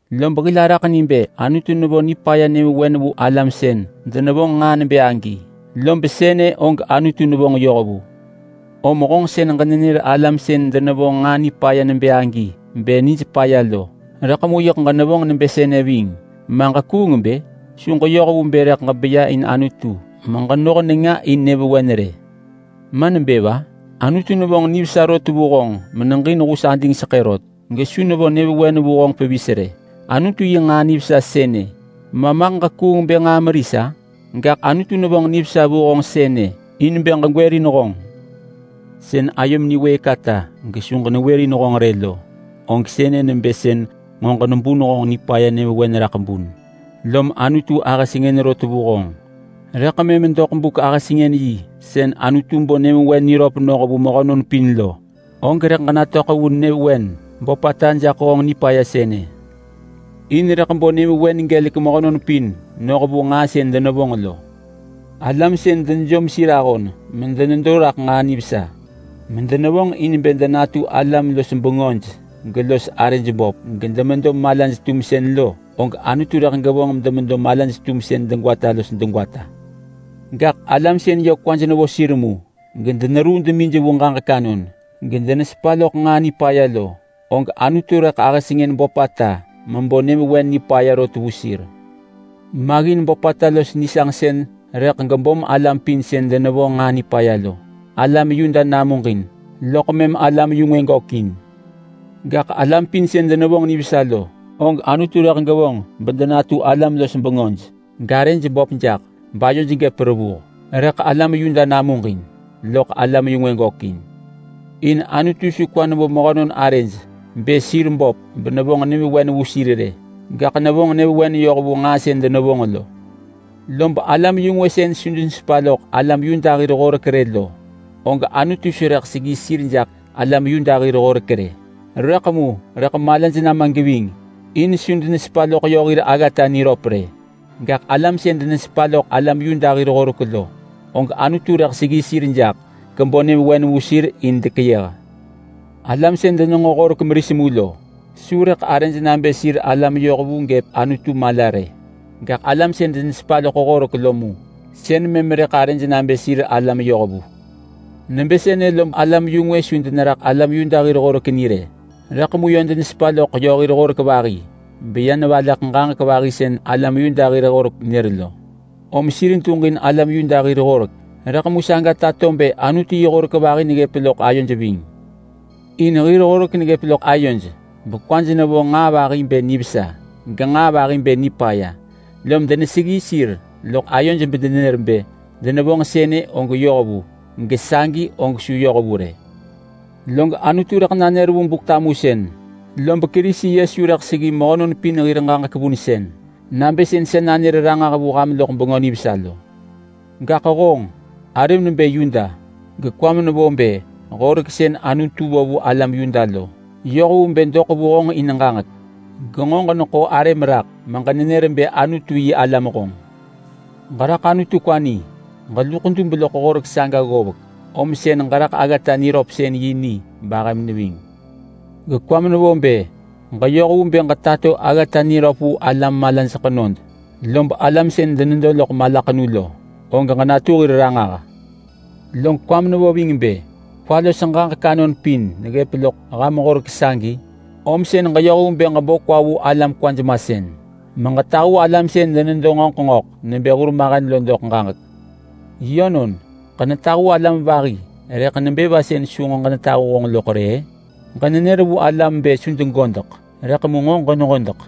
Lob hil araḳ ni bë Anutu nevo nipaya nyëvewen vu alam sën denevonġ nġaa nebë agi, lob sënë og Anutu nevonġ yoh vu. Om honġ sën ġenenër alam sën denevonġ nġaa nipaya nebë agi bë nij paya lo, rëḳ mu yiḳ ġenevonġ nebë sënë ving, ma ġekuung bë? Su ġeyoh vu bë rëḳ ġebeya in Anutu meġenoh nenga in nyëvewen rë. Ma nebë va? Anutu nevonġ nivesa rot vu honġ meneġin hus adingseḳë rot gesu nevo nyëvewen vu honġ pevis rë. Anutu yi nġaa nivesa sënë, maḳ ġekuung bë nġaa meris-a? Gaḳ Anutu nevonġ nivesa vu honġ sënë in bë ġegwërin honġ. Sën ayom niwëëk ata gesu ġenewërin honġ rë lo, og sënë nebë sën nġo ġenebun honġ nipaya nyëvewen raḳ bun, lom Anutu ahë sengën rot vu honġ. Rëḳ mëm doḳ buk-ahësengën-yi sën Anutu bo nyëvewen niröp noh vu mehönon pin lo, og rëḳ ġenatöḳ vu nyëvewen böpata jaḳ honġ nipaya sënë. In rëḳ bo nyëvewen gelek mehönon pin noh vu nġaa sën denevonġ lo. Alam sën denejom sir ahon medenedo raḳ nġaa nivesa medenevonġ in bë denatu alam-los-bengöj gelos arëj böp gedemedo malaj-tumsën lo, og Anutu rëḳ gevonġ bedemedo malaj-tumsën degwata los degwata. Gaḳ alam sën yö kwaj nevo sir mu gedeneruu demij vu ġaġek anon, gedenesepa loḳ nġaa nipaya lo, og Anutu rëḳ ahë sengën böpata mebo nyëvewen nipaya rot vu sir. Maggin böpata los nisanġsën rëḳ gebom alam pin sën denevonġ nġaa nipaya lo. Alam Yuda namuġin, loḳ mëm alam-yu-ngwë gökin. Gaḳ alam pin sën denevonġ nivesa lo, og Anutu rëḳ gevonġ bedenatu alam-los-bengöj, garëj böp jaḳ, bayoj gëp revuh. Rëḳ alam Yuda namuġin, loḳ alam-yu-ngwë gökin. In Anutu su kwa nevo mehönon arëj bë sir böp benevonġ nyëvewen vu sir rë, gaḳ nevonġ nyëvewen yoh vu nġaa sën denevonġ lo. Lob alam-yu-ngwë sën su denesepa loḳ alam Yuda hir horek rë lo, og Anutu su rëḳ seggi sir jaḳ alam Yuda hir horek rë, rëḳ mu rëḳ malaj nama geving in su denesepa loḳ yö hir aggata niröp rë. Gaḳ alam sën denesepa loḳ alam Yuda hir horek lo, og Anutu rëḳ seggi sir jaḳ, gebo nyëvewen vu sir in dekeyëh. Alam sën denenġo horek meris mu lo su rëḳ arëj nabë sir alam yohvu gëp Anutu mala rë. Gaḳ alam sën denesepa loḳ horek lo mu, sën mëm rëḳ arëj nabë sir alam yohvu. Nebë sënë lob alam-yu-ngwë su deneraḳ alam Yuda hir horek ni rë, rëḳ mu yö denesepa loḳ yö hir horek vahi beya nevaleḳ ġaġek vahi sën alam Yuda hir horek nër lo. Om sir duġin alam Yuda hir horek rëḳ mu saga tato bë Anutu yi horek vahi neggëp loḳ ayoj ving. In hir horek neggëp loḳ ayoj bekwaj nevo nġaa vahi bë nivesa genġaa vahi bë nipaya, lom deneseggi sir loḳ ayoj bedenenër bë denevonġ sënë, og yoh vu, gesagi, og su yoh vu rë. Log Anutu rëḳ nanër vu Buk-tamusën, lob Kerisi Yesu rëḳ seggi mehönon pin hir ġaġek vunsën nabë sën sa nanër ranġah vu ham loḳ Bengö Nivesa lo. Gaḳ honġ! Arëm nebë Yuda, gekwam nevo bë horek sën Anutu vo vu alam Yuda lo yoh vu bë doḳ vu honġ in ġaġek. Genġo ġeneḳo arëm raḳ meġenenër bë Anutu-yi-alam honġ. Ġeraḳ Anutu kwa ni. Ġeluḳ dub loḳ horek saga ggovek, om sën ġeraḳ aggata niröpsën-yi ni bahëm neving. Gekwam nevo bë ġeyoh vu bë ġetato aggata niröp vu alam malaj ḳenod, lob alam sën denedo loḳ malaḳenu lo, og ġetato ranġah vu sir. Log kwam nevo ving nebë kwa los ġaġek anon pin neggëp loḳ ham horek sagi, om sën ġeyoh vu bë ġebo kwa vu alam kwaj masën meġetahu alam sën denedo ngöḳ ngöḳ nebë hurmahen lo doḳ ġaġek. Yönon, ġenetahu alam vahi, rëḳ nebë va sën su nġo ġenetahu honġ loḳ rë-ë? Ġenenër vu alam bë su degodeḳ, rëḳ mu nġo ġenehodeḳ.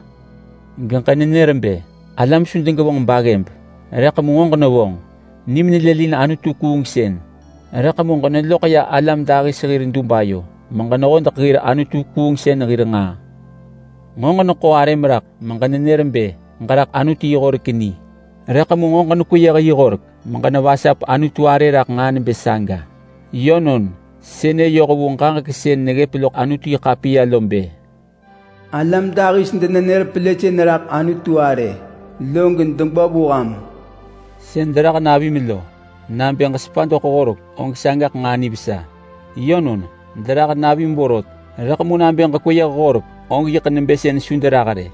Geġenenër bë alam su degevonġ baggëb, rëḳ mu nġo ġenevonġ. Nim nelëlin anutu-kuungsën rëḳ mu ġeneloḳ ya alam dahis hir dub ayo meġenehodeḳ hir anutu-kuungsën hir nġaa. Nġo ġeneḳo arëm raḳ meġenenër bë ġeraḳ Anutu yi horek ni, rëḳ mu nġo ġenekweyëh yi horek meġenevasap Anutu arë raḳ nġaa nebë saga. Yönon, sënë yoh vu ġaġek sën neggëp loḳ Anutu-yi-ḳapiya lo bë: Alam dahis denenër pelësën raḳ Anutu arë, log degwa vu ham. Sën derah navim lo, nabë ġesepa doḳ Horek, og sagaḳ nġaa nivesa. Yönon, derah navim vorot, rëḳ mu nabë ġekweyëh horek, og yiḳ nebë sën su derah rë.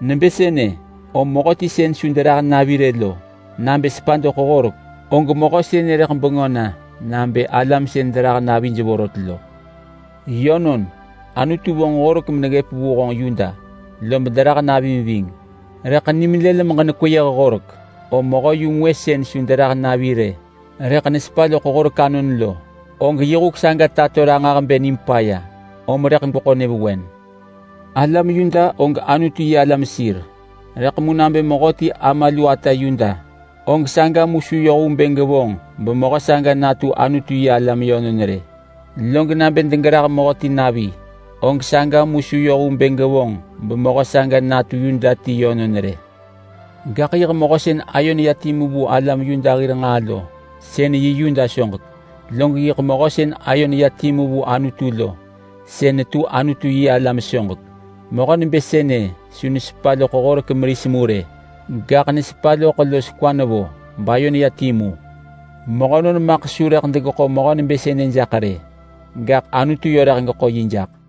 Nebë sënë, om mehöti sën su derah navi rë lo, nabë sepa doḳ horek, og mehö sënë rëḳ bengö na nabë alam sën derah navij vorot lo. Yönon, Anutu vonġ horek meneggëp vu honġ Yuda, lob derah navim ving. Rëḳ nim lël meġenekweyëh horek, om mehö-yu-ngwë sën su derah navi rë rëḳ nesepa loḳ horek anon lo, og yi huk saga tato ranġah bë nim paya om rëḳ gweḳo nyëvewen. Alam Yuda og Anutu-yi-alam sir, rëḳ mu nabë mehöti ama lu ata Yuda, og saga mu su yoh vu bë gevonġ bemehö saga natu Anutu-yi-alam yönon rë. Log nabë degerah mehöti navi, og saga mu su yoh vu bë gevonġ bemehö saga natu Yuda ti yönon rë. Gaḳ yiḳ mehö sën ayo neya timu vu alam Yuda hir nġaa lo, sën yi Yuda soġek. Log yiḳ mehö sën ayo neya timu vu Anutu lo, sën netu Anutu-yi-alam soġek. Mehö nebë sënë su nesepa loḳ horek meris mu rë, gaḳ nesepa loḳ los kwa nevo, bayo neya timu. Mehönon maḳ su rëḳ degeḳo mehö nebë sënë jaḳ rë, gaḳ Anutu yö rëḳ geḳo yi jaḳ.